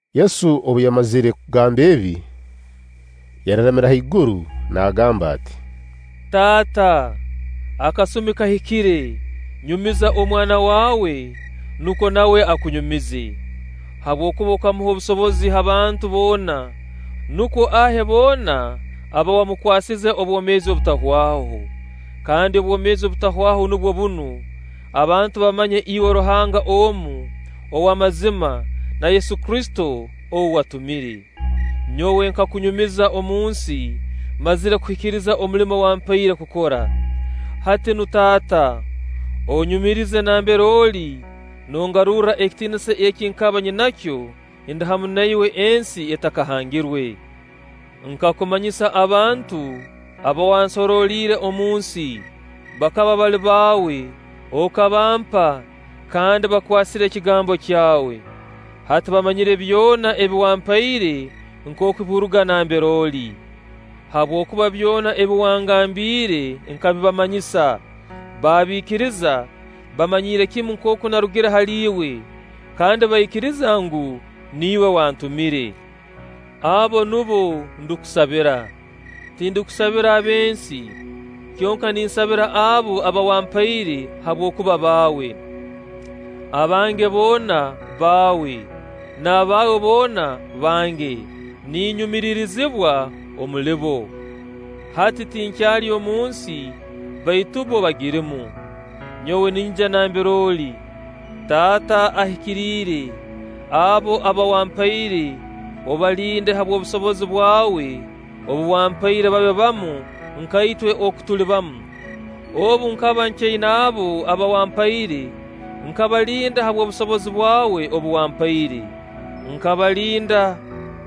Yesu obu yamazire kugamba ebi, yararamira haiguru nagamba ati: “Taata, akasumi kahikire; nyumiza Omwana waawe, nukwo nawe akunyumize. Habwokuba okamuha obusobozi ha bantu boona, nukwo ahe boona aba wamukwasize obwomeezi obutahwaho. Kandi obwomeezi obutahwaho nubwo bunu: abantu bamanye iwe Ruhanga omu, ow'amazima, na Yesu Kristo ou watumire. Nyowe nkakunyumiza omunsi, mmazire kuhikiriza omulimo wampaire kukora. Hati nu Taata, onnyumiririze nambere oli nongarurra ekitiinisa eki nkaba nyinakyo ndi hamu na iwe ensi etakahangirwe. “Nkakumanyisa abantu aba wansoroliire omunsi. Bakaba bali baawe, okabampa, kandi bakwasire ekigambo kyawe. Hati bamanyire byona ebi wampaire nkooku biruga nambere oli; habwokuba byona ebi wangambiire nkabibamanyisa, baabiikiriza, baamanyira kimu nkooku narugire hali Iwe, kandi baikiriza ngu, niiwe wantumire. Abo nubo ndukusabira. Tindukusabira ab'ensi, kyonka ninsabira abo aba wampaire, habwokuba baawe. Abange boona, baawe; n'abaawe boona, bange. Ninyumiririzibwa omuli bo. Hati tinkyali omunsi, baitu bbo bagirumu. Nyowe ninyija nambere oli. Taata Ahikiriire, abo aba wampaire obalinde habw'obusobozi bwawe obu wampaire babe bamu nka itwe oku tuli bamu. Obu nkaba nkyaina abo aba wampaire, nkabalinda habw'obusobozi bwawe obu wampaire. Nkabalinda,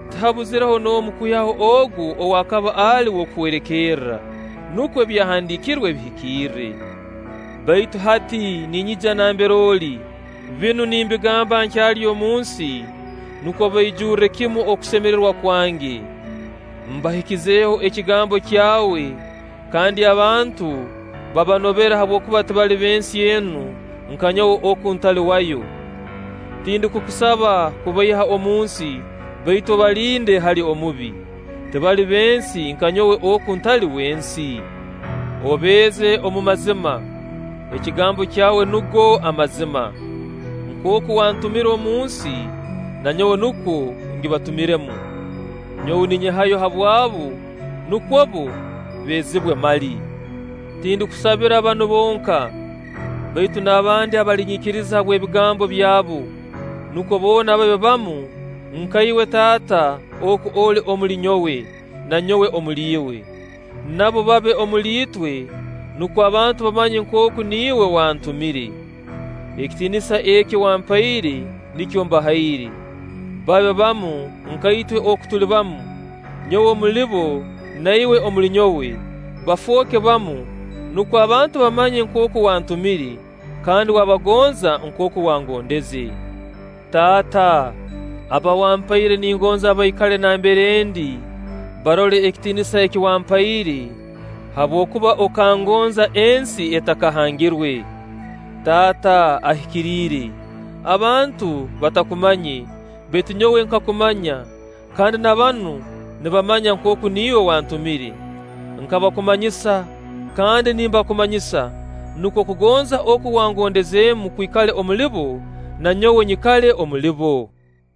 tihabuzireho n'omu kwihaho ogu ou akaba ali w'okuhwerekerra, nukwo Ebyahandiikirwe bihikirre. Baitu hati ninyija nambere oli. Binu nimbigamba nkyali omunsi, nukwo baijurre kimu okusemererwa kwange. Mbahikizeho ekigambo kyawe; kandi abantu babanobere habwokuba tibali b'ensi enu, nka nyowe oku ntali wayo. Tindukukusaba kubaiha omunsi, baitu obalinde hali Omubi. Tibali b'ensi nka nyowe oku ntali w'ensi. Obeeze omu mazima. Ekigambo kyawe nugo amazima. Nkooku wantumire omunsi, na nyowe nukwo ngibatumiremu. Nyowe ninyehayo habwabu, nukwo bbo beezibwe mali.” “Tindukusabira banu bonka, baitu n'abandi abalinyikiriza habw'ebigambo byabo, nukwo boona babe bamu nka Iwe Taata oku oli omuli nyowe, na nyowe omuli Iwe. Nabo babe omuli itwe, nukwo abantu bamanye nkooku niiwe wantumire. Ekitiinisa eki wampaire, nikyo mbahaire. Babe bamu nka itwe oku tuli bamu, nyowe omuli bo na Iwe omuli nyowe. Bafooke bamu, nukwo abantu bamanye nkooku wantumire, kandi wabagonza nkooku wangondeze. Taata, aba wampaire, ningonza baikale nambere ndi, barole ekitiinisa eki wampaire, habwokuba okangonza ensi etakahangirwe. Taata Ahikiriire, abantu batakumanye, baitu nyowe nkakumanya; kandi na banu nibamanya nkooku niiwe wantumire. Nkabakumanyisa, kandi ndibakumanyisa, nukwo okugonza oku wangondezeemu kwikale omuli bo, na nyowe nyikale omuli bo.”